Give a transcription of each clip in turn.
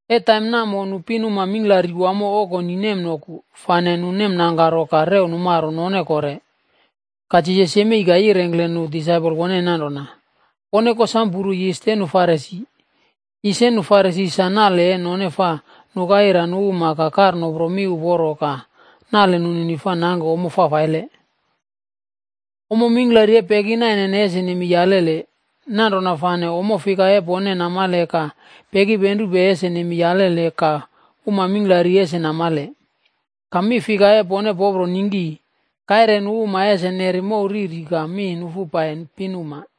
E taim namo nu pinuma mingklari wamo okoni nemnoku, fane nu nemnangkaro ka rew numaro none kore. Ka Jisas yemei ka yirengkle nu disaipol woneni nanrona, “Pone kosamo puru yisa e nu Farisi. Yis e nu Farisi sa nale e none fa nuka ira nu uma ka kar nopro mi uporo ka nale nunini fa nangke ommo fafaile. Ommo mingklari e peki nainene ese nemei alele. Nanrona fane ommo fika e pone namale ka pekipenrupe ese nemei alele ka uma mingklari ese namale. Ka mi fika e pone popro ningki, kaire nu uma ese neri mow riri ka mi nufu pai nu pinuma.”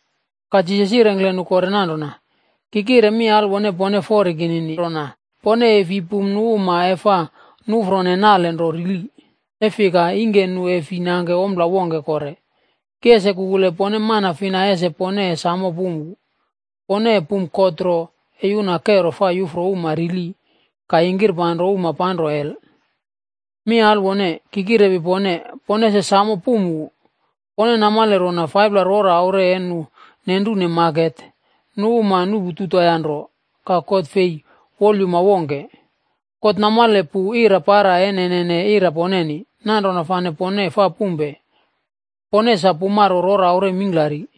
Ka Jisas yirengkle nu kore nanrona, “Ki kire mi alwone pone fori kinini rona, pone e fi pum nu uma e fa nuꞌfrone nale nro rili, e fika ingke nu e fi nangke ompla wongke kore. Ki ese kukule pone mana fina ese pone e sam pum wu. Pone e pum God nro e yuna kero fa yufro uma rili ka yingkirpanro uma panro hel. Mi alwone! Ki kirepi pone, pone ese samo pum wu. Pone namale rona 5pla rora aure e nu nenrune maket, nu uma nuꞌpu 2toea nro.b Ka God e fi wolyuma wongke. God namale pu ira para e nene ira poneni. Nanrona fane pone fa pumpe, pone sa pumaro rora aure mingklari.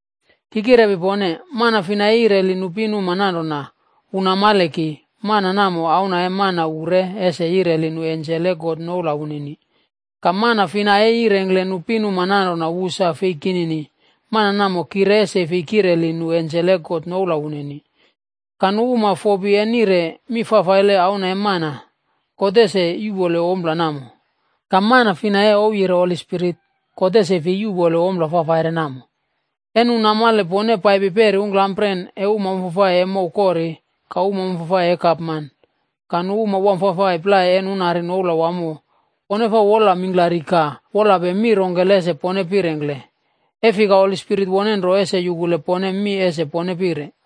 “Ki kirepi pone, mana fina e yireli nu pinuma nanrona, wu namale ki, mana namo Auna e Mana wu re ese yireli nu ensel e God noula wunini. Ka mana fina e yirengkle nu pinuma nanrona wu sa fei kinini, mana namo ki re ese fi kireli nu ensel e God noula wunini. Ka nu uma fopi e nire mi fafaile Auna e Mana, God ese yuꞌpole ompla namo. Ka mana fina e ouwyire Holi Spirit, God ese fei yuꞌpole ompla fafaire namo. “E nu numale pone paipi peri ungklampren e uma wamfafai e mow kori ka uma wamfafai e gapman ka nu uma wamfafai plai e nunari noula wamo, pone fa wol mingklaripe ka wolape mi rongkele ese pone pirengkle. E fika Holi Spirit wone nro ese yukule pone mi ese pone pire.”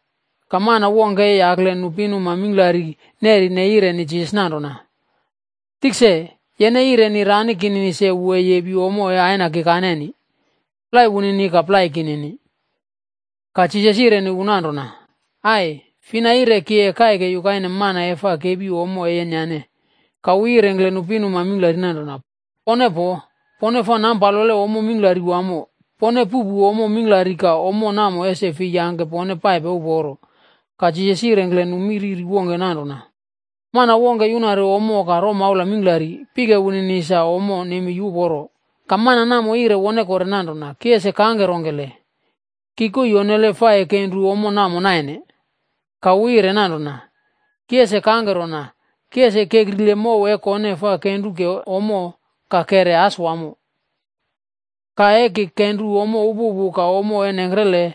Ka mana wongke e yakle nu pinuma mingklari nerine ka yireni Jisas nanrona, “Tikse, yene yireni rani kinini se wu e yepi ommo e Aina kikaneni, plai wunini ka plai kinini.” Ka Jisas yireni wu nanrona, “Ai! Fina yire ki e kaike yukaine mana e fa kepi ommo e yenyane?” Ka wu yirengkle nu pinuma mingklari nanrona, “Pone poo! Pone fa nampalope ommo mingklari wamo. Pone puꞌpu ommo mingklari ka ommo namo ese fei yangke pone paipe uporo.” Ka Jisas yirengkle nu mi riri wongke nanrona, “Mana wongke yunari ommo ka romaula mingklari, pike wunini sa ommo nemei uporo. Ka mana namo yire wone kore nanrona, ‘Ki ese kangke rongkele? Ki koii onnele fa e kenru ommo namo naine.’ “Ka wu yire nanrona, ‘Ki ese kangke rona, ki ese kekrile mow e kone fa kenru ke ommo ka kere as wamo. Ka e ki kenru ommo upupu ka ommo e nengkrele,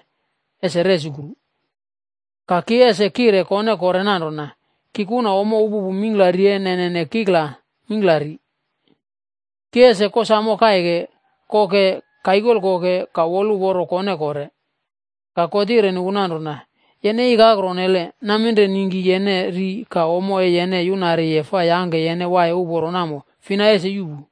ese resukru. Ka ki ese kire kone kore nanrona, “Ki kuna ommo upupu mingklari e nene kikla mingklari. Ki ese kosamo kaike, koke, kaikolko ka woluporo kone kore.” ’ “Ka God yireni wu nanrona, ‘Yene ikakro onnele! Naminre ningki yene ri ka ommo e yene yunariye fa yangke yene waiye uporo namo fina ese yuꞌpu.’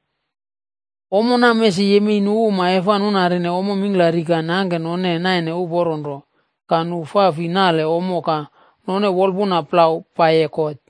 “Ommo namo ese yemei nu uma e fa nunarine ommo mingklari ka nangke none naine uporone ka nu fa fi nale ommo ka none wolpuna plau paiye God.”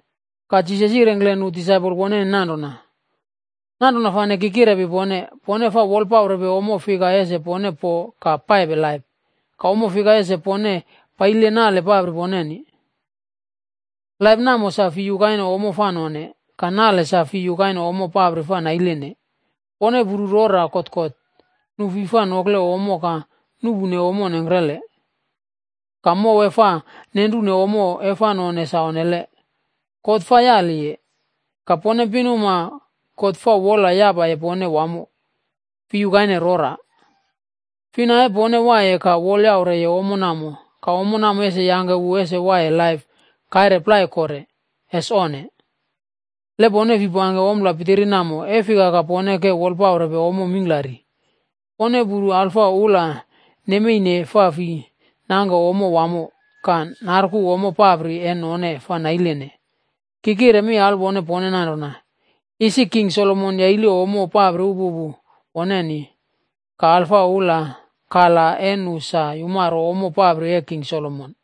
Ka Jisas yirengkle nu disaipol woneni nanrona, “Nanrona fane ki kirepi pone, pone fa wolpaurepe ommo fika ese pone po ka paipe laip, ka ommo fika ese pone paile nale papri poneni. Laip namo sa fi yukaine ommo fa none, ka nale sa fi yukaine ommo papri fa nailene. Pone puru rora kotkot, nu fi fa nokle ommo ka nuꞌpune ommo nengkrele, ka mow e fa nenrune ommo e fa none sa onnele, God fa yaliye. Ka pone pinuma God fa wol yapaye pone wamo, fi yukaine rora. Fina e pone waiye ka wolyaure ommo namo, ka ommo namo ese yangke wu as waiye laip kaire plai kore. Ese onne! Le pone fi pangke ompla pitiri namo, e fika ka pone ke wolpaurepe ommo mingklari? “Pone puru alfa ula nemeine fa fi nangke ommo wamo ka narku ommo papri e none fa nailene. Ki kire mi alwone pone nanrona, isi King Solomon yaile ommo papri upupu woneni, ka alfa ula, kala e nu sa yumaro ommo papri e King Solomon.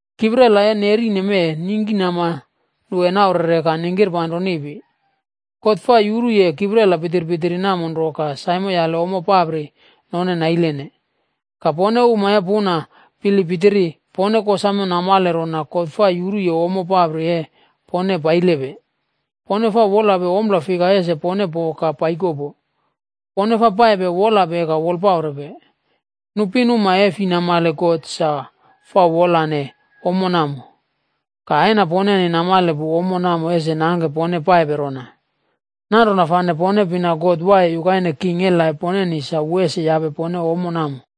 Kiprela e nerine mee, ningkinama nu naurere ka ningkipanro niꞌpi. God fa yuruye kiprela pitpitiri namo nro ka saimoyale ommo papri none nailene. Ka pone uma e puna bilip pitiri, pone kosamo namale rona God fa yuruye ommo papri e pone pailepe. Pone fa wolape ompla fika ese pone po ka paikopo. Pone fa paipe wolape ka wolpaurepe. Nu pinuma e fi namale God sa fa wolane ommo namo. Ka Aina poneni namale pu ommo namo ese nangke pone paipe rona. Nanrona fane pone pina God waiye yukaine king e laip poneni sa wu ese yape pone ommo namo.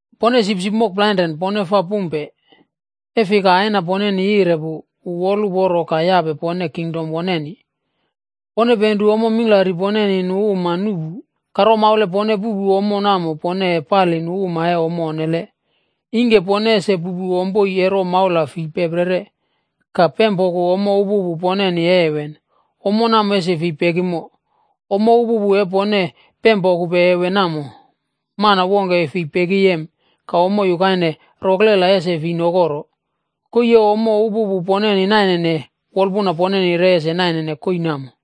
“Pone sipsipc mokplainren, pone fa pumpe, e fika Aina poneni yire pu, wu woluporo ka yape pone kingdom woneni. Pone penru ommo mingklari poneni nu uma nuꞌpu ka romaula e pone puꞌpupe ommo namo pone e pali nu uma e ommo onnele. Ingke pone ese puꞌpu ompoi e romaula fi peperi, ka pempoku ommo upupu poneni e heven, ommo namo ese fi pekimo. Ommo upupu e pone pempokupe heven namo, mana wongke e fi pekiyem ka ommo yukaine roklela ese fi nokoro. Koii e ommo upupu poneni nainene, wolpuna poneni re ese naine koii namo.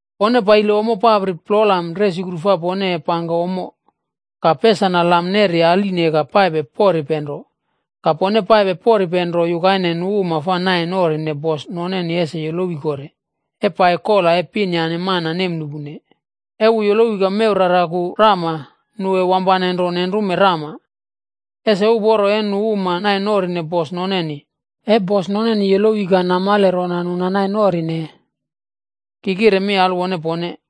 “Pone paile ommo papri plolam resukru fa pone e pangke ommo, ka pesana lam neri aline ka paipe poripe nro. Pone paipe poripe nro yukaine nu uma fa nai norine bos noneni ese yolowi kore, e pai kola e pin yane mana nemnuꞌpune. E wu yolowi ka mew raraku rama, nu e wampane nro nenrume rama. Ese uporo, e nu uma nai norine bos noneni, e bos noneni yolowi ka namale rona nu nanaine norine. Ki kire mi alwone pone,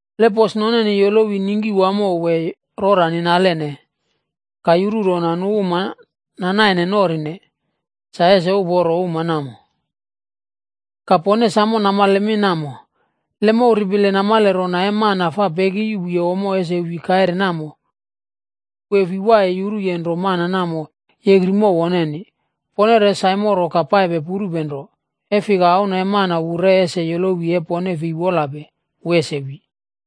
Le bos noneni yolowi ningki wamo wee rora ninalene, ka yuru rona nu uma nanaine norine, sa ese uporo uma namo. “Ka pone sam namale mi namo: Le mow ripile namale rona e mana fa peki yuꞌpu ommo ese wi kaire namo, wu e fi waiye yuruye nro mana namo yekri mow woneni. Pone re saimoro ka paipe purupe nro, e fika Auna e Mana wu re ese yolowi e pone fei wolape, wu ese wi.”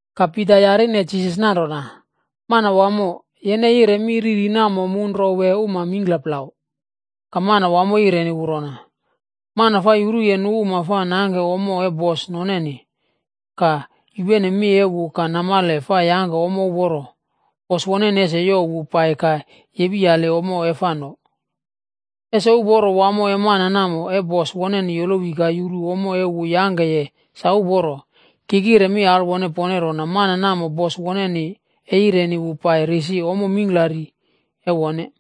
Ka Pita yarine Jisas nanrona, “Manawamo, yene yire mi riri namo mu nro wee uma mingkla plau?” Ka Manawamo yireni wu rona, “Mana fa yuruye nu uma e fa nangke ommo e bos noneni, ka yupene mi e wu ka namale fa yangke ommo uporo, bos woneni ese youw wu pai ka yepiyali ommo e fa no. Ese uporo wamo e mana namo, e bos woneni yolowi ka yuru ommo e wu yangkeye sa uporo. Ki kire mi alwone pone rona mana namo bos woneni e yireni wu pai risi ommo mingklari e wone.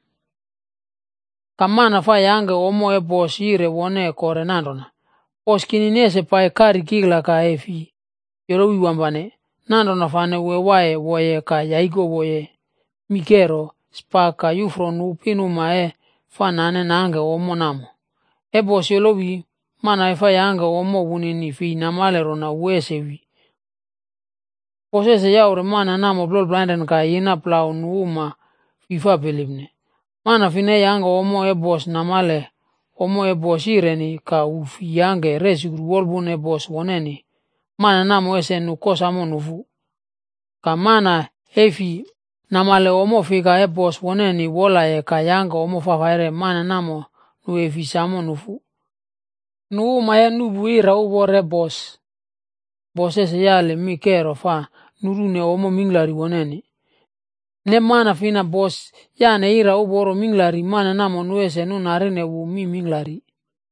Ka mana fa yangke ommo e bos yire wone kore nanrona, ‘Bos kinini ese pai kari kikla ka e fi yolowi wampane,’ nanrona fane wu waiye woye ka yaikowo mii kero, spak ka yufro nu pinuma e fa nane nangkene ommo namo. E bos yolowi, mana e fa yangke ommo wunini fei namale rona wu ese wi. Bos ese yaure mana namo plola plainren ka yina plau nu uma fi fa bilipne. “Mana fina fa yangke ommo e bos namale ommo e bos yireni ka wu fi yangke resukru wolpuna e bos woneni, mana namo ese nu kosamo nufu. Ka mana e fi namale ommo fika e bos woneni wolaye ka yangke ommo fafaire, mana namo, nu e fi sam nufu. Nu uma e nuꞌpu ira uporo e bos, bos ese yali mi kero fa nurune ommo mingklari woneni. Ne mana fina, bos yane ira uporo mingklari, mana namo nu ese nunarine wu mi mingklari.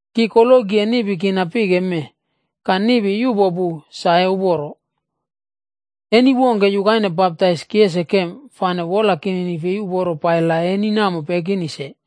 “Ki koloki e niꞌpi kina pike mee, ka niꞌpi yuꞌpo pu sa e uporo. Eni wongke yukaine baptaise ki ese kem, fane wola kinini fei uporo pai la eni namo pekini se.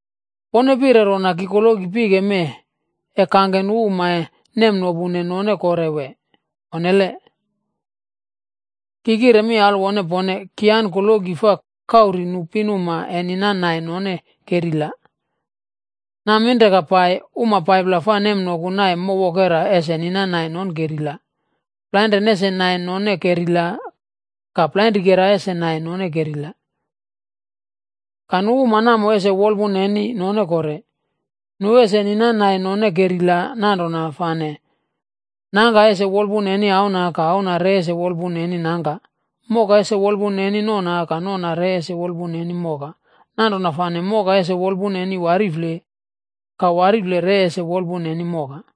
Pone pire rona ki koloki pike mee e kangke nu uma e nopune, e fi nopu none kore wee? Onne! Ki kire mi alwone pone, ki an koloki fa kauri nu pinuma e ninan nai none kerila. Naminre ka pai, uma 5pla fa nemnoku naine mow wokera ese ninanai none kerila. Plainren ese naine none kerila ka plainrikera ese naine none kerila. Ka nu uma namo ese wolpuna neni none kore. Nu ese ninanai none kerila nanrona fane nangka ese wolpuna neni auna ka auna re ese wolpuna neni nangka. Moka ese wolpuna neni nona ka nona re ese wolpuna neni moka, nanrona fane moka ese wolpuna neni warifle, ka warifle re ese wolpuna neni moka.”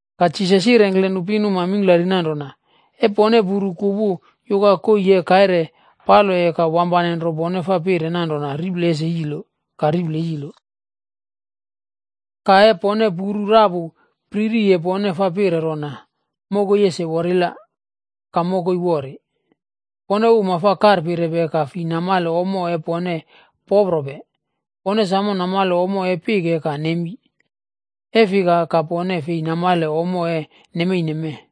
Ka Jisas yirengkle nu pinuma mingklari nanrona, “E pone puru kupu yuka koii e kaire paloye ka wampane nro pone fa pire nanrona, ‘Riple ese yilo,’ ka riple yilo. Ka e pone puru rapu pririye pone fa pire rona, ‘Mokoi ese worila,’ ka mokoi wori. Pone uma fa karpirepe ka fi namale ommo e pone poprope! Pone samo namale ommo e pike ka nemi. E fika ka pone fei namale ommo e nemeine mee?”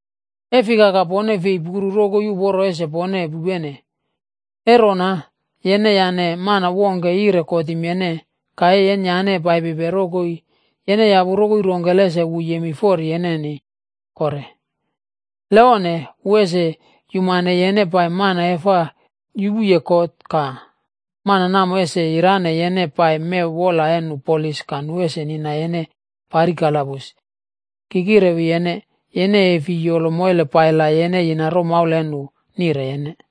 “E fika ka pone fei puru rokoi uporo ese pone pupene? E rona yene yane mana wongke yire kotim yene, ka e yenyane paipipe rokoi yene yapu rokoi rongkele ese wu yemei fori yeneni kore. Le onne, wu ese yumane yene pai mana e fa yupuye kot ka mana namo ese yirane yene pai mew wola e nu polis ka nu ese nina yene pari kalabus. Ki kirewi yene, yene e fei yolo moile pai la yene yina romaula e nu nire yene.”